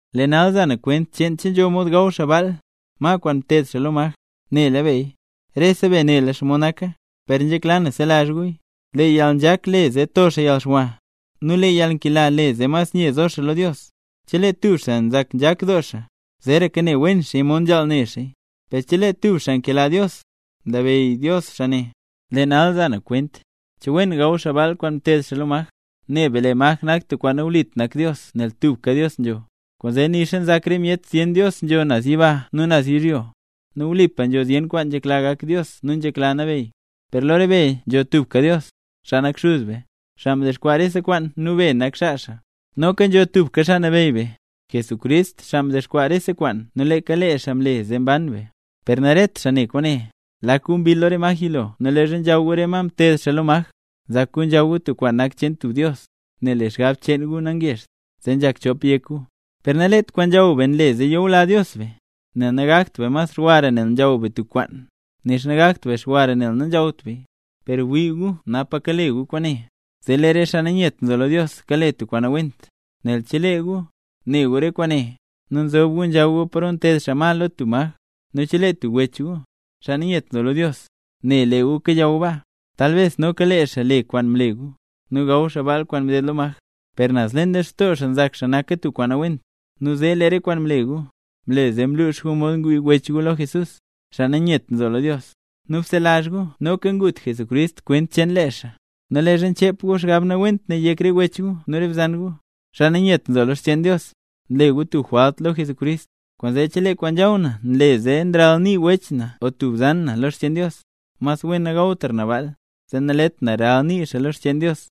Lee nal za na kwent cheen che nzho mod gaw xaa baal, ma kwaan mteed xaa lo maj. Nela beya: “Rese be nela xomod naka”. Per nzhekla na selazh guya: “Lee yalnzhak le zee to xaa yalxwa, nu lee yalnkela le zee mas nye zo xaa lo Dios”. Chelee tub xaa nzak nzhak doo xaa, zeraka ne wen xaaya mod nzhaal ne xaaya. Per chelee tub xaa nkela Dios, nlabeyy Dios xaa ne. Lee nal za na kwent, che wen gaw xaa baal kwaan mteed xaa lo maj. Ne be lee maj nak tub kwaan nawlit nak Dios nel tubka Dios nzho. Kwaanzee nixa nzak re myet zyen dios nzho naz yiba nu naz yizhyo, (nu wlipa nzho zyen kwaan nzhekla gak Dios nu nzhekla nabeyy), per lo re be nzho tubka Dios, xaa nak Xuz be, xaa mdexkwaa rese kwaan nu be nak xaa xaa. Noka nzho tubka Xaa Nabeyy be, Jesucrist, xaa mdexkwaa rese kwaan nu leeka lee xaa mle zee mban be. Per naret xaa ne kwaane. Lak gu mbill lo re maj yilo nu leezha nzhaw gu re ma mteed xaa lo maj, nzak gu nzhaw gu tub kwaan nak cheen tub dios. Nel lee xgab cheen gu nangezht, zee nzhak chop yek gu. Per nalet kwaan nzhaw be nle zee nyula Dios be, nel nagakt be mas xwara nel nzhaw be tub kwaan, nixa nagakt be xwara nel nanzhawt beya. Per wii gu napa kale gu kwaane, zee lee re xaa nanyet nzo lo Dios kale tub kwaan nawent. Nel chelee gu, ne gu re kwaane, nu nzob gu nzhaw gu paro nteed xaa ma lo tub maj, nu chelee tub wech gu, xaa nanyet nzo lo Dios, ne lee gu kayaw baa, talbes noka lee xaa le kwaan mle gu, nu gaw xaa baal kwaan mded lo maj. Per naz leen lextoo xaa nzak xaa naka tub kwaan nawent, nu zee lee re kwaan mle gu, mle zee mluux mod ngwii wech gu lo Jesús; xaa nanyet nzo lo Dios. Nu bselazh gu noka ngut Jesucrist kwent cheen lee xaa. Nu leezha nchep gu xgab nawent ne yek re wech gu nu re bzan gu, xaa nanyet nzo lo xcheen Dios, nle gu tub jwalt lo Jesucrist. Kwaanzee, chelee kwaan nzhaw na nle zee nralnii tub wech na o tub bzan na lo xcheen Dios, mas wen nagawtra na baal, zee nalet na ralnii xaa lo xcheen Dios.